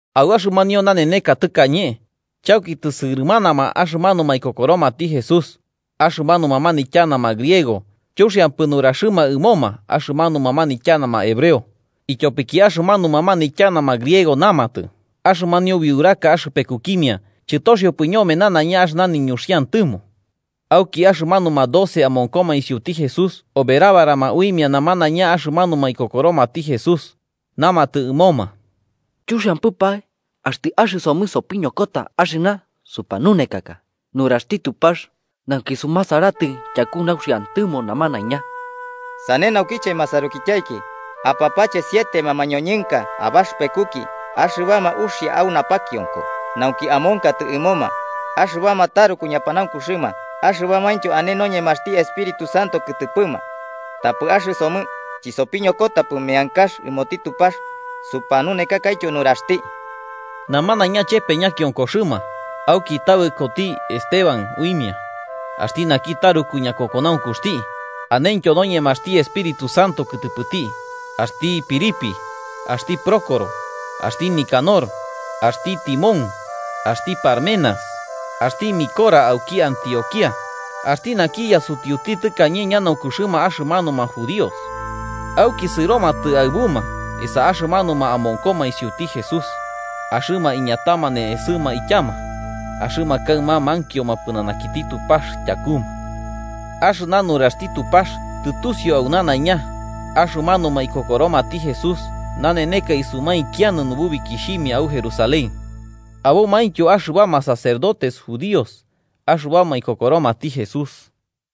Au axɨmanio naneneka tɨkañe, chauki tɨsɨrɨmanama axɨmanuma ikokoromati Jesús, axɨmanuma manityanama griego chuxiampɨ nuraxɨma ɨmo axɨmanuma manityanama hebreo, ityopiki axɨmanuma manityanama griego namatɨ axɨmanio biuraka axɨpekukimia chɨtoxiopɨ ñome nanaiña axɨna niñuxiantɨmo. Auki axɨmanuma doce amonkoma isiuti Jesús oberabarama uimia namanaiña axɨmanuma ikokoromati Jesús, namatɨ ɨmoma: –Chuxiampɨpae axtɨ axɨsomɨ sopiñokota axɨna supanunekaka nuraxti Tupax nauki sumasaratɨ tyaku nauxiantɨmo namanaiña. Sane naukiche masarukityaiki, apapache sietema mañoñɨnka abaxɨpekuki axɨbama uxia au napakionko nauki amonkatɨ ɨmoma, axɨbama taruku ñapanaunkuxɨma axɨbamaintyo ane noñemaxti Espíritu Santo kɨtɨpɨma. Tapɨ axɨsomɨ chɨsopiñokotapɨ meankax ɨmoti Tupax supanunekakaityo nuraxti. Namanaiña chepe ñakionkoxɨma, auki tabɨkoti Esteban uimia, axti naki taruku ñakokonaunkuxti, anentyo noñemaxti Espíritu Santo kɨtɨpɨti, axti Felipe, axti Prócoro, axti Nicanor, axti Timón, axti Parmenas, axti Nicolás auki Antioquía, axti naki yasutiuti tɨkañe ñanaunkuxɨma axɨmanuma judíos. Auki sɨromatɨ aɨbuma esa axɨmanuma amonkoma isiuti Jesús, axɨma iñatama ne'esɨma ityama, axɨma kaɨma mankioma pɨnanakiti Tupax tyakuma. Axɨna nuraxti Tupax tɨtusiu au nanaiña, axɨmanuma ikokoromati Jesús naneneka isumainkianɨ nubukixhimia au Jerusalén. Abomaintyo axɨbama sacerdotes judíos axɨbama ikokoromati Jesús.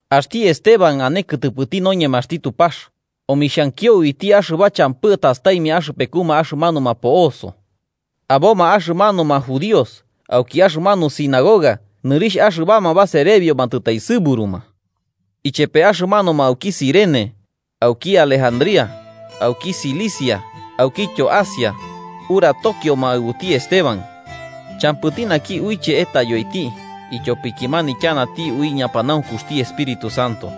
Axti Esteban, ane kɨtɨpɨti noñemaxti Tupax, omixhankio uiti axɨba champɨ tastaimia axɨpekuma axɨmanuma po'oso. Aboma axɨmanuma judíos auki axɨmanu sinagoga nɨrixh axɨbama Baserebioma tɨtaesɨburuma. Ichepe axɨmanuma auki Cirene, auki Alejandría, auki Cilicia aukityo Asia, uratokioma aɨbuti Esteban. Champɨti naki uiche etayoiti ityopiki manityanati ui ñapanaunkuxti Espíritu Santo.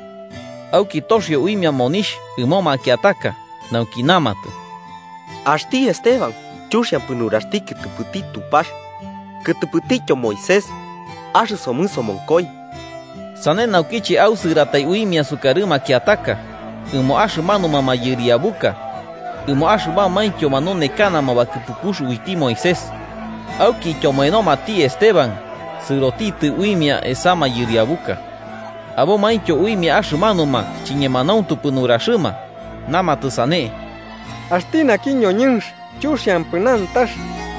Auki toxio uimia monixh ɨmo makiataka nauki namatɨ: “Axti Esteban chuxiampɨ nuraxti kɨtɨpɨti Tupax kɨtɨpɨtityo Moisés. Axɨsomɨ somonkoi.” Sane naukiche ausɨratai uimia sukarɨ makiataka, ɨmo axɨmanuma mayɨriabuka, ɨmo axɨbamaintyo manunekanama bakɨpukux uiti Moisés. Auki ityomoenomati Esteban sɨrotitɨ uimia esa mayɨriabuka. Abomaintyo uimia axɨmanuma chiñemanauntupɨ nuraxɨma, namatɨ sane: –Axti naki ñoñɨnx chuxiampɨ nantax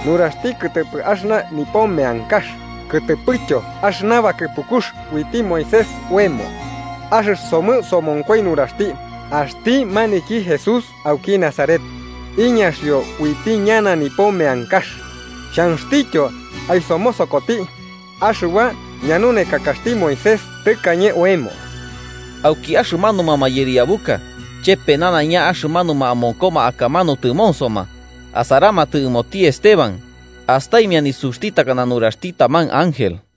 nuraxti kɨtɨpɨ axɨna nipo meankax kɨtɨpɨtyo axɨna bakɨpukux uiti Moisés oemo. Axɨsomɨ somonkoi nuraxti, axti maniki Jesús auki Nazaret iñaxio uiti ñana nipo meankax, xhanxtityo aisomosokoti axɨba ñanunekakaxti Moisés tɨkañe oemo. Auki axɨmanuma mayɨriabuka ichepe namanaiña axɨmanuma amonkoma akamanu tɨmonsoma, asaramatɨ ɨmoti Esteban, astaimia nisuxti takana nisuxti taman ángel.